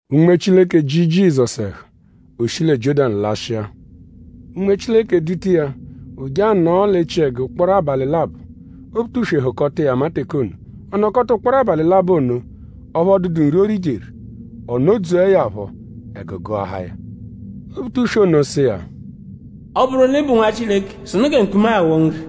Unme Chileke ji Jizọsu ẹhu. O shi lẹ Jiọ́danu lashịa. Unme Chileke duta iya; o je anọo l'echiẹgu ụkporo abalị labọ. Obutuswe hụkota iya ama teke ono. Ọ nọkota ụkporo abalị labọ ono; ọphu ọ dụdu nri, o rijeru. Ọ nọ-dzuẹ ya phọ; ẹgu gụahaa ya. Obutuswe ono sụ iya: “Ọ -bụru l'ị bụ Nwa Chileke sụnu gẹ mkpuma-a ghọo nri!”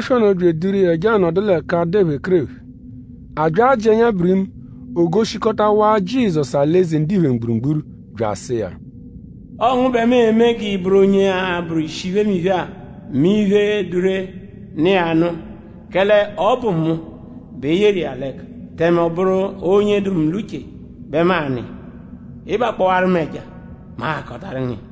Obutuswe ono bya eduru iya je anọdu l'ẹka dụ ephekerephe. A bya ajị ẹnya birimu; o goshikọtawaa Jizọsu alị-eze ndiphe mgburugburu; bya asụ iya: “Ọo ngu bẹ mu e-me g'ị bụru onye a-bụru ishi iphemiphe-a mẹ iphe, dụ ree, nọ iya nụ; kẹle ọ bụ mu bẹ e yeru iya l'ẹka; tẹme ọ bụru onye dụ mu l'uche bẹ mu a-nụ iya. Ị -bakpọwaru mu ẹja; mu ahakọtaru ngu iya.”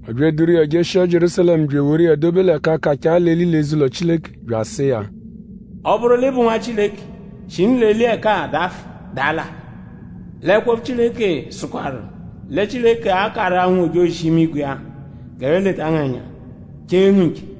Ọ bya eduru iya jeshia Jierúsalẹmu bya eworu iya dobe l'ẹka kachaa l'eli l'eze-ụlo Chileke bya asụ iya: “Ọ -bụru l'ị bụ Nwa Chileke; shinu l'eli ẹka-a dafụ daa l'alị. L'ẹkwo-opfu Chileke sụkwaru lẹ Chileke a-karụ-a ụnwu-ojozi-imigwe iya g'ẹphe leta ngu ẹnya; chee ngu nche.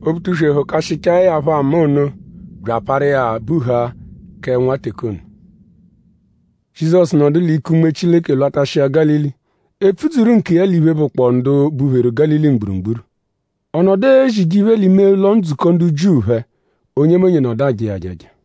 Obutuswe hụkashichae ya phọ ama ono bya aparu iya buhaa kẹ nwa teke ono. Jizọsu nọdu l'ike Unme Chileke lwatashịa Gálili. E pfudzuru nkiya l'iphe, bụkpoo ndu bupheru Gálili mgburugburu. Ọ nọdu ezije iphe l'ime ụlo-ndzukọ ndu Jiu phẹ. Onyemonye nọdu aja iya ajaja.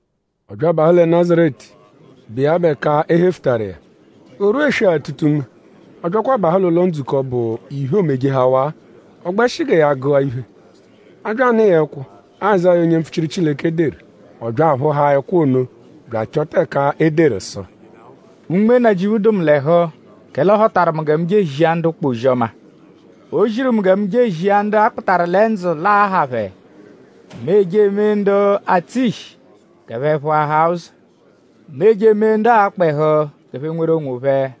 Ọ bya abahụ lẹ Nazaretu, bụ iya bụ ẹka e hefutaru iya. O rwua eswe-atụta-unme; ọ byakwa abahụ l'ụlo-ndzukọ, bụ iphe, oomejehawaa. Ọ gbẹshi gẹ ya gụa iphe. A bya anụ iya ẹkwo, Azáya onye mpfuchiru Chileke deru. Ọ bya aphụhaa ẹkwo ono bya achọta ẹka e deru sụ: “Unme Nnajịuphu dụ mu l'ẹhu; kẹle ọ họtaru mu gẹ mu je ezia ndu ụkpa ozi-ọma. O ziru mu gẹ mu je ezia ndu a kpụtaru lẹ ndzụ l'aa-ha phẹ; Mu eje emee ndu atsụ ishi g'ẹphe phụahaa ụzo. Mu eje emee ndu aakpa ẹhu g'ẹphe nweru onwophẹ.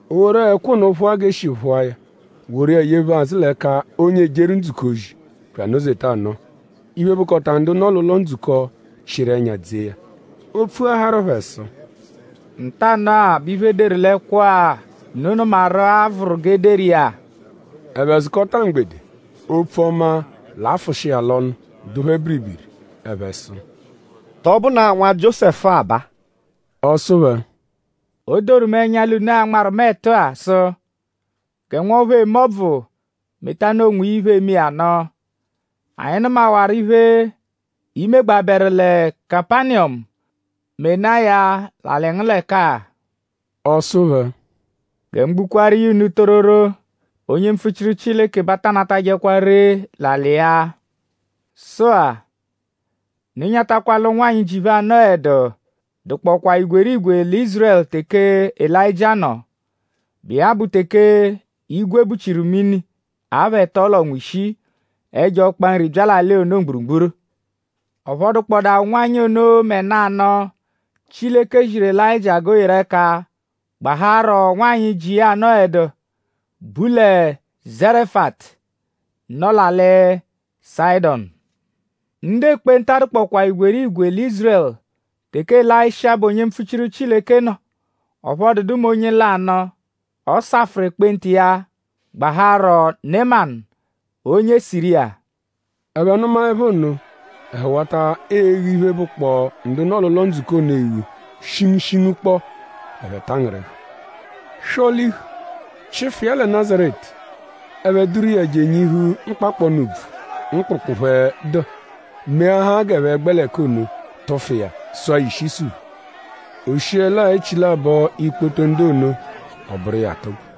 O woru ẹkwo ono phụa g'e shi phụa ya; woru iya yephu azụ l'ẹka onye ejeru ndzukọ ozi; bya anọ-zeta anọo. Iphe, bụkota ndu nọ l'ụlo-ndzukọ chịru ẹnya dzee ya. O pfuaharu phẹ sụ: “Ntanụ-a bẹ iphe, e deru l'ẹkwo-a, unu nụmaru-a vụru g'e deru iya.” Ẹphe zụkota mgbede. Opfu ọma, l'afụshi iya l'ọnu dụ phẹ biribiri. Ẹphe sụ: “?Tọ bụnaa nwa Jiósẹfu-a baa?” Ọ sụ phẹ: “O doru mu ẹnya l'unu a-nmarụ mu ẹtu-a sụ: ‘Gẹ nwọphu eme ọbvu metanụ onwiya iphe, eme iya nụ. Anyi nụmawaru iphe, i megbabẹru lẹ Kapaniyọmu; menaa ya l'alị ngu l'ẹka-a.’” Ọ sụ phẹ: “Gẹ mu gbukwaaru iya unu tororo; Onye mpfuchiru Chileke bẹ a ta anatajẹkwa ree l'alị iya. Sụ-a; unu nyatakwa l'ụnwanyi, ji phẹ anọedu dụkpokwaa igwerigwe lẹ Ízurẹlu teke Elayịjia nọ, bụ iya bụ teke igwe buchiru mini apha ẹto l'ọnwa ishii; ẹjo ọkpa nri bya l'alị ono mgburugburu. Ọphu ọ dụkpodaa ụnwanyi ono mẹ nanụ, Chileke ziru Elayịjia g'o yeru ẹka; gbahaarọ nwanyị, ji iya anọedu, bu lẹ Zarefatu, nọ l'alị Sayịdonu. Ndu ekpenta dụkwapho igwerigwe lẹ Ízurẹlu teke Elayisha, bụ onye mpfuchiru Chileke nọ. Ọphu ọ dụdu mẹ onye lanụ, ọ safụru ekpenta iya; gbaharọ Nemanu onye Siriya.” Ẹphe nụmaepho nno; ẹhu wata eghu iphe, bụkpoo ndu nọ l'ụlo-ndzukọ ono eghu shingushingu kpọ. Ẹphe tangịrihu. Swọ-lihu; chịfu iya lẹ Nazaretu. Ẹphe duru iya je enyihu mkpakpọnu úbvú, mkpụkpu phẹ dụ; meahaa g'ẹphe gbẹ l'ẹka ono tụfu iya; sụa ya ishi isuphu. O shiẹlaa echilabọ ikpoto ndu ono; ọ bụru iya atụgbu.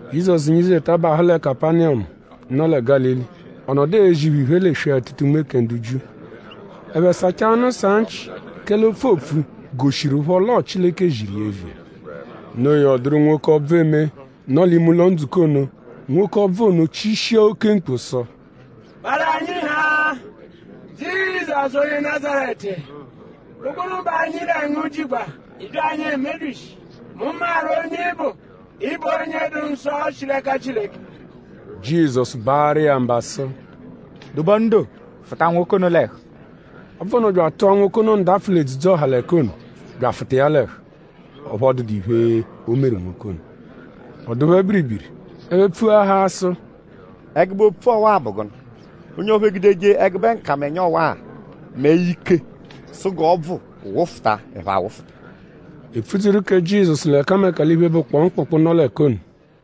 Jizọsu nyizeta bahụ lẹ Kapaniyọmu, nọ lẹ Gálili. Ọ nọdu ezi phẹ iphe l'eswe-atụta-unme kẹ ndu Jiu. Ẹphe sachaa ọnu saa nchị kẹle opfu, oopfu goshiruphọ l'ọo Chileke ziru iya eviya. No iya; ọ dụru nwoke, ọbvu eme, nọ l'ime ụlo-ndzukọ ono. Nwoke ọbvu ono chishia oke mkpu sụ: “Parụ anyi haa; Jizọsu onye Nazaretu!?Bụ gụnu bẹ anyi lẹ ngu jigba??Ị bya anyi emebyishi? Mu maru onye ị bụ. Ị bụ onye dụ nsọ, shi l'ẹka Chileke.” Jizọsu baarụ iya mba sụ: “Dobe ọnu doo! Fụta nwoke ono l'ẹhu!” Ọbvu ono bya atụa nwoke ono ndapfụ l'edzudzu-ọha l'ẹka ono; bya afụta iya l'ẹhu; ọphu ọ dụdu iphe, o meru nwoke ono. Ọ dụ phẹ biribiri. Ẹphe pfuahaa sụ: “?Ẹgube opfu ọwa-a bụ gụnu? Onye ọphu egudeje ẹgube nkamẹnya ọwa mẹ ike sụ g'ọbvu wụfuta; ẹphe awụfuta.” E pfudzuru kẹ Jizọsu l'ẹkameka l'iphe, bụkpoo mkpụkpu, nọ l'ẹka ono.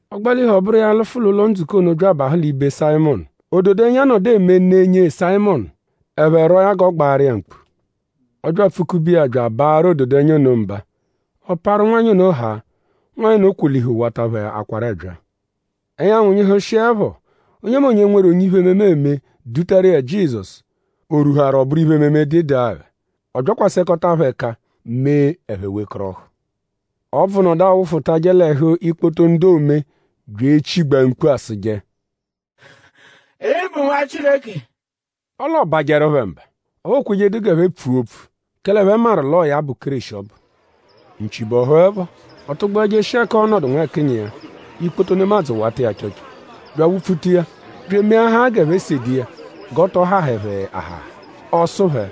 Ọ gbalihu; ọ bụru iya alụfu l'ụlo-ndzukọ ono bya abahụ ibe Sayịmonu. Ododẹnya nọdu eme ne nyee Sayịmonu. Ẹphe rwọo ya g'ọ gbaaru iya mkpu. Ọ bya apfụ-kube iya bya abaarụ ododẹnya ono mba; ọ parụ nwanyị ono haa; nwanyị ono kwolihu wata phẹ akwaru ẹbyaa. Ẹnyanwu nyịhushiepho; onyemonye, nweru onye iphe-ememe eme dutaru iya Jizọsu; o rwuharu ọ bụru iphe-ememe, dụ ịdagha. Ọ byakwasẹkota phẹ ẹka mee ẹphe wekọrohu. Ọbvu nọdu awụfutaje l'ẹhu ikpoto ndu oome bya echigbaa mkpu asụje: “Ị bụ Nwa Chileke!” Ọle ọobajeru phẹ mba. Ọphu o kwejedu g'ẹphe pfua opfu; kẹle ẹphe maru l'ọo ya bụ Kéreshi ọbu. Nchi bọhuepho; ọ tụgbua jeshia ẹka ọo-nọdu nwẹkinyi iya. Ikpoto nemadzụ wata iya achọcho bya awupfuta iya; bya emeahaa g'ẹphe sede iya g'ọ tọ hahẹ phẹ ahaha. Ọ sụ phẹ: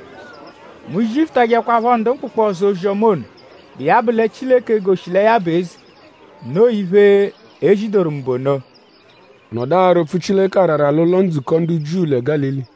“Mu zifutajẹkwapho ndu mkpụkpu ọzo ozi-ọma ono, bụ iya bụ lẹ Chileke egoshi lẹ ya bụ eze. Noo iphe, e zidoru mu bụ ono.” Ọ nọdu ara opfu Chileke arara l'ụlo-ndzukọ ndu Jiu lẹ Gálili.